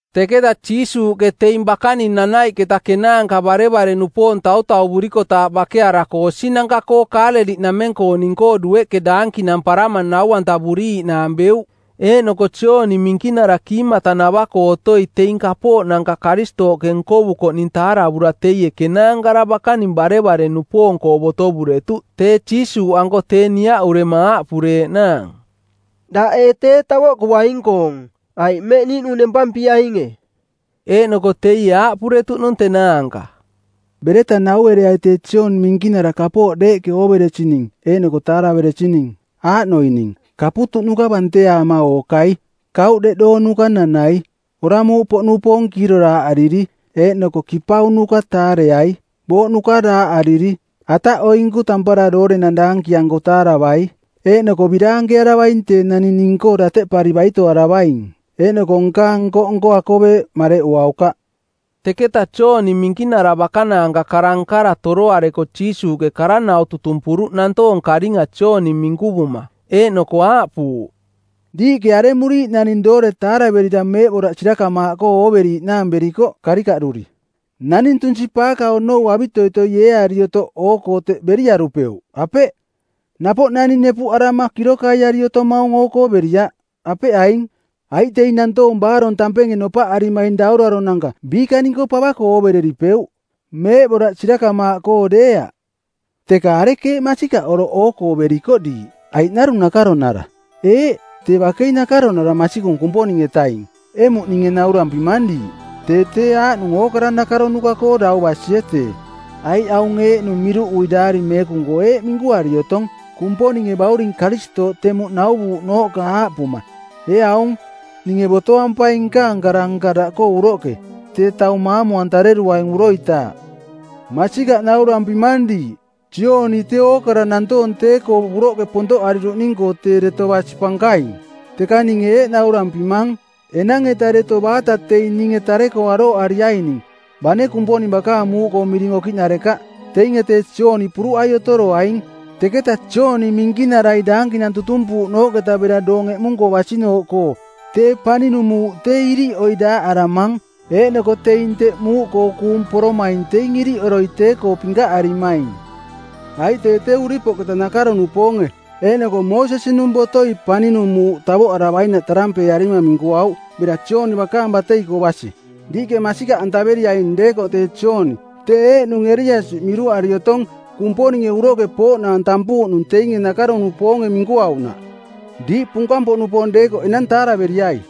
Teketa Jiisuuꞌke teing bakaning nanaiꞌketa kenaanka barevare-nupoong tautauvurikotaaꞌ bakearako osinanka-koo Kaaleliꞌnameng-kooning-koo dueꞌke daankinamparama nau-antavuriiꞌnaang beuꞌ. Eeꞌnoko Jooni Minkinara kiimata-navaꞌkoo otoi teing kapooꞌnanka Karistooꞌke nkovukoꞌning taaravura teie kenaankara bakaning barevare-nupoong-koo botovuretuꞌ tee Jiisuuꞌanko tee niaꞌurema aaꞌpureeꞌnaang, “Daꞌ ee tee tavoꞌkuaing-koong, aiꞌ mmeꞌ niiꞌnung nempampiainge?” Eeꞌnoko teie aaꞌpuretuꞌnung tenaanka, “Bereta nauereai tee Jooni Minkinara kapooꞌ deeꞌke ooveresining eeꞌnoko taaraveresining; Aaꞌnoining: kaputuꞌnuka banteaama ookai, kauꞌ deꞌdoonuka nanai, oramuuꞌpoꞌnupoong kiiroraaꞌariri eeꞌnoko kipaunuka taareai, booꞌnuka daaꞌariri, ataꞌoinku tampara doorenang daankianko taaravai. Eeꞌnoko biraankearavaing tee naning ning-koo dateꞌpari baitoaravaing, eeꞌnoko nkaang nko-nko akoveeꞌ mareꞌuaukaꞌ.” Teketa Jooni Minkinara bakanaanka kara-nkara toroareko Jiisuuꞌke kara-nau tutumpuruꞌ nantoong karinga Jooni minkuvuma, eeꞌnoko aaꞌpuuꞌ, “Diiꞌke aremuriiꞌ naning doore taaraverira meeꞌboraꞌ sirakamaaꞌkoo ooveriiꞌnaang berikoꞌ karikaꞌduri? Naning tunsi-paaka onou avitoitoi eeari otoꞌ oo-koo teꞌ beriarupeuꞌ, apeꞌ? Napoꞌ naning nepuꞌarama kirokaiari otomaung oo-koo beriaꞌ, apeꞌ aing? Aiꞌ teing nantoong baarong tampenge nopaꞌarimaing dauraronanka biikaning-koo pava-koo oovereripeuꞌ, meeꞌboraꞌ sirakamaaꞌkoo deeaꞌ. Teka arekeeꞌ masikaꞌ oroꞌ oo-koo berikoꞌ diiꞌ, aiꞌ narung nakaronara? Eeꞌ, tee bakei nakaronara masikung Kumponing-etaing emuꞌ ninge naurampimang diiꞌ. Tee tee aaꞌnung ookara nakaronuka-koo dau basie tee. Aiꞌ aung eeꞌnung miruꞌui Daari Meekung-koo eeꞌ minkuari otong Kumponinge bauring Karistooꞌ temuꞌ nauvuuꞌnooꞌka aaꞌpuma, ‘Ee aung, ninge botoampaing nkaang kara-nka daꞌkoo uroꞌke tee taung maamu-antareruaing uroitaaꞌ.’ Masikaꞌ naurampimang diiꞌ, Jooni tee ookara nantoong tee-koo uroꞌke pontoꞌariruꞌning-koo tee deto basi pankaing, teka ninge eeꞌ naurampimang, enang-eta deto baata teing ninge tare-koo arooꞌariaining, bane Kumponing bakaang muuꞌkoo miring okiꞌnarekaꞌ, teinge tee Jooni puruꞌai otoroaing. Teketa Jooni Minkinarai daankinang tutumpuuꞌnooꞌketa bera doong eꞌmunung-koo basi-nooꞌkoo tee paninung muuꞌ tee iriꞌoi daaꞌaramang, eeꞌnoko teing teꞌ muuꞌkoo kuung poromaing teing iriꞌoroi tee-koo pinkaꞌarimaing. Aiꞌ tee tee uripoꞌketa nakaro-nupoonge eeꞌnoko Moosesi-nung botoi paninung muuꞌ tavoꞌaravainaꞌ tarampeearima˜ minkuauꞌ bera Jooni bakaang batei-koo basi. Diiꞌke masika-antaveriaing deekoꞌ tee Jooni tee eeꞌnung Eliasi miruꞌari otong Kumponinge uroꞌke pooꞌnaang tampuuꞌnung teinge nakaro-nupoonge minkuauꞌnaꞌ. Diiꞌ punkang-poꞌnupoong deekoꞌ enang taaraveriai!”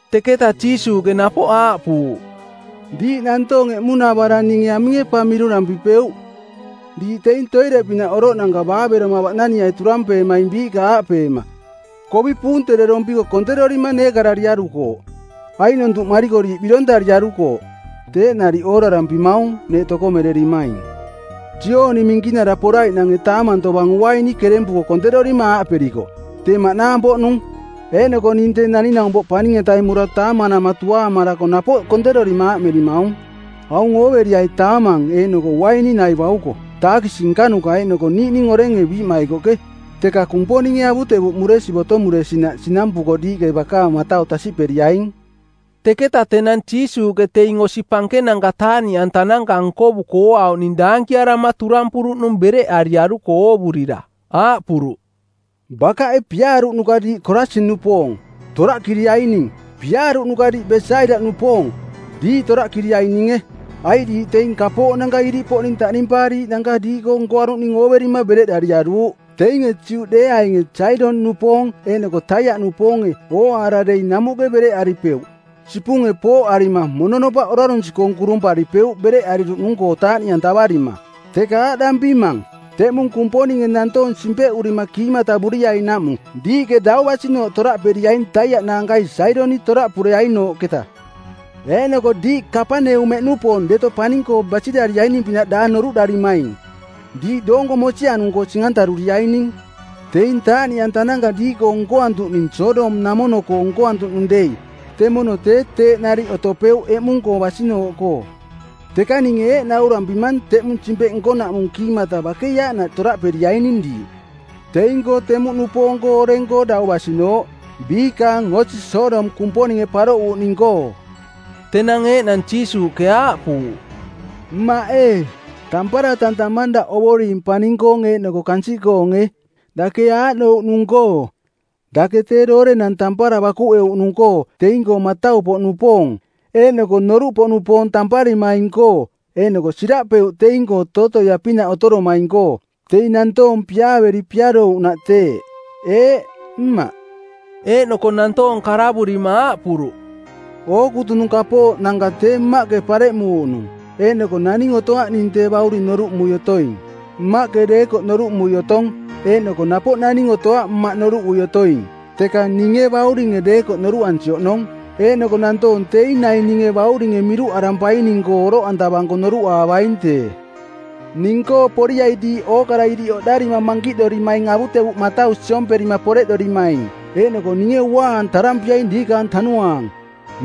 Teketa Jiisuuꞌke napoꞌ aaꞌpuuꞌ, “Diiꞌ nantoong emuꞌnavarang ninge aminge pa miruꞌdampipeuꞌ? Diiꞌ teing toireꞌpinaꞌ oroꞌnanka baaveroma baꞌnaniai turampeemaing biiꞌka aaꞌpeema, ‘Kovi puunterorompiko konterorima neekarariarukooꞌ. Aiꞌnontuꞌmariko diiꞌ birontariarukooꞌ.’ Teeꞌ nariꞌ oorarampimaung neeꞌ tokomererimaing. Jooni Minkinara poraiꞌnange taamang tovang uaini kerempuko konterorima aaꞌperikoꞌ, ‘Tee maꞌnaang-poꞌnung.’ Eeꞌnoko ning Tee Naning-naumpoꞌ Paning-etaing mora taamanama tuaamarako napoꞌ konterorima aaꞌmerimaung, ‘Aung ooveriai taamang eeꞌnoko uaini nai bauko, taakisi nkanuka eeꞌnoko niiꞌning orenge biiꞌmaikoꞌke!’ Teka Kumponinge avutevuꞌmuresi botomuresinaꞌ sinampuko diiꞌke bakaang matau tasiꞌperiaing.” Teketa tenang Jiisuuꞌke teing osi pankenanka taaꞌniꞌantananka nkovuko ooauꞌning daankiarama turampuruꞌnung bereꞌariaruko oovurira. Aaꞌpuruꞌ, “Bakaꞌe piaaruꞌnuka diiꞌ Korasin-nupoong, toraꞌkiriaining. Piaaruꞌnuka diiꞌ Besaida-nupoong, diiꞌ toraꞌkiriaininge, aiꞌ diiꞌ teing kapooꞌnanka iriꞌpoꞌning taꞌnimpaariiꞌnanka diiꞌkoo nkoaruꞌning ooverima bereꞌdariaruuꞌ. Teinge Juꞌdeeaing Saidoniꞌnupoong eeꞌnoko Taiaꞌnupoonge ooaara dei namuꞌke bereꞌaripeuꞌ sipunge pooꞌarima mononopaꞌ orarunsi-koong kurumparipeuꞌ bereꞌariruꞌnung-koo taaꞌniꞌantavarima. Teka aaꞌdampimang, teꞌmung Kumponinge nantoong simpeꞌurima kiimatavuriainaꞌmung diiꞌke dau basinooꞌ toraꞌperiaing Taiaꞌ naankai Saidoniꞌ toraꞌpureainooꞌketa. Eeꞌnoko diiꞌ Kapaneumeꞌnupoong deto paning-koo basirariaining-pinaꞌ daang noruꞌdarimaing. Diiꞌ doonko mosianung-koo sing-antaruriaining. Teing taaꞌniꞌantananka diiꞌkoo nkoantuꞌning Sodom-namono-koo nkoantuꞌnung dei temono tee teeꞌ nariꞌ otopeuꞌ eꞌmung-koo basinooꞌkoo. Teka ninge eeꞌ naurampimang teꞌmung simpeꞌ nkonaꞌmung kiimata bakei aaꞌnaꞌ toraꞌperiaining diiꞌ, teing-koo temuꞌnupoong oreng-koo dau basinooꞌ, biikaang osi Sodom Kumponinge paroꞌuuꞌning-koo.” Tenang eeꞌnang Jiisuuꞌke aaꞌpuuꞌ, “Mmaꞌ ee, tampara tantamang daꞌ Ovoring paning-koong eeꞌnoko kansiꞌkoonge, dake aaꞌnouꞌnung-koo: Dake tee doorenang tampara bakuꞌeuꞌnung-koo teing-koo matau-poꞌnupoong eeꞌnoko noruꞌpoꞌnupoong tamparimaing-koo eeꞌnoko siraꞌpeuꞌ teing-koo tootoia-pinaꞌ otoromaing-koo. Teing nantoong piaaveri piarouꞌnaꞌ teeꞌ. Eeꞌ, Mmaꞌ.” Eeꞌnoko nantoong karavurima aaꞌpuruꞌ, “Ookutunung kapooꞌnanka tee Mmaꞌke pareꞌmuuꞌnung, eeꞌnoko naning otoaꞌ ning Tee Bauring noruꞌmui otoing, Mmaꞌke deekoꞌ noruꞌmui otong. Eeꞌnoko napoꞌ naning otoaꞌ Mmaꞌ noruꞌui otoing, teka ninge Bauringe deekoꞌ noruꞌansi oꞌnong. Eeꞌnoko nantoong teing naing ninge Bauringe miruꞌarampaining-koo oroꞌantavanko noruꞌaavaing tee. “Ning-koo poriai diiꞌ ookara iriꞌ oꞌdarima mankiꞌdorimaing avutevuꞌ matau siomperima poreꞌdorimaing, eeꞌnoko ninge uaa-antarampiaing diikaang tanuaang.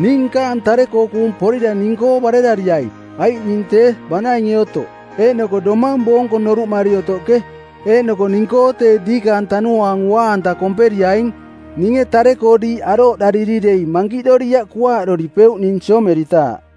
Ning nkaang tare-koo kuung porira ning-koo barerariai, aiꞌ ning tee banainge otoꞌ, eeꞌnoko domang boonko noruꞌmari otoꞌke. Eeꞌnoko ning-koo tee diikaang tanuaang uaa-anta komperiaing. Ninge tare-koo diiꞌ arooꞌdariri dei mankiꞌdoriaꞌ kuaaꞌdoripeuꞌ ning siomeritaaꞌ.”